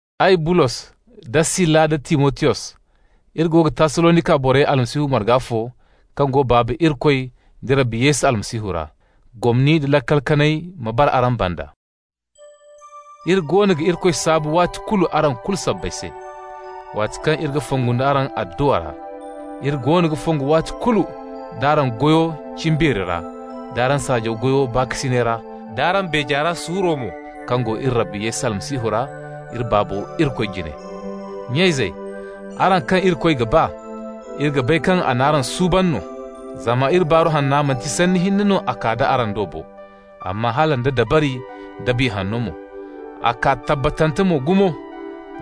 Ay, Bulos, da Sila nda Timotiyos, iri go ga Tassalonika borey Almasihu marga fo kaŋ go Baaba Irikoy da Rabbi Yesu Almasihu ra. Gomni nda laakal kanay ma bara araŋ banda. Iri goono ga Irikoy saabu waati kulu araŋ kulu sabbay se, waati kaŋ iri ga fongu araŋ adduwa ra. Iri goono ga fongu waati kulu nd'araŋ goyo cimbeeri ra, d'araŋ saajaw goyo baakasinay ra, d'araŋ beeja ra suuro mo kaŋ go iri Rabbo Yesu Almasihu ra, iri Baabo Irikoy jine. Nya-izey, araŋ kaŋ Irikoy ga ba, iri ga bay kaŋ a n'araŋ suuban no. Zama iri Baaru Hanna, manti sanni hinne no a kaa d'a araŋ do bo, amma hala nda dabari, da Biya Hanno mo. A kaa tabbatante mo gumo.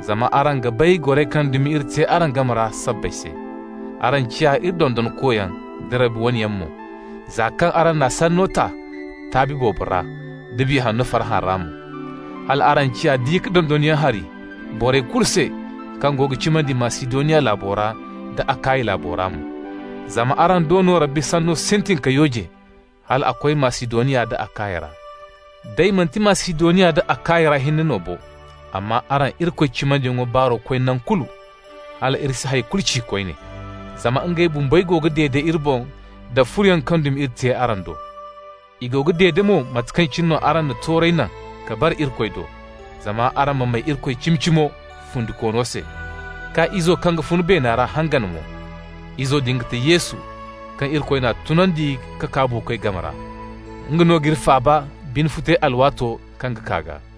Zama araŋ ga bay goray kaŋ dumi iri te araŋ game ra araŋ sabbay se. Araŋ ciya iri dondonkoyaŋ da Rabbi wane yaŋ mo, za kaŋ araŋ n'a sanno ta taabi boobo ra, da Biya Hanno farhã ra mo. Hal araŋ ciya di-ka-dondonyaŋ hari borey kulu se kaŋ go ga cimandi Masidoniya laabo ra, da Akaya laabo ra mo. Zama araŋ do no Rabbi sanno sintin ka yooje, hal a koy Masidoniya nda Akaya ra. Day manti Masidoniya nda Akaya ra hinne no bo, amma araŋ Irikoy cimandiyaŋ baaro koy naŋ kulu, hal iri si hay kulu ci koyne. Zama ngey bumbey go ga dede iri boŋ da furoyaŋ kaŋ dumi iri te araŋ do. I go ga dede mo mate kaŋ cine araŋ na toorey naŋ ka bare Irikoy do, zama araŋ ma may Irikoy cimi-cimo, fundikoono se, k'a Izo kaŋ ga fun beena ra hangan mo. Izo din ga ti Yesu, kaŋ Irikoy n'a tunandi ka kaa buukoy game ra. Nga no g'iri faaba bine futay alwaato kaŋ ga kaa gaa.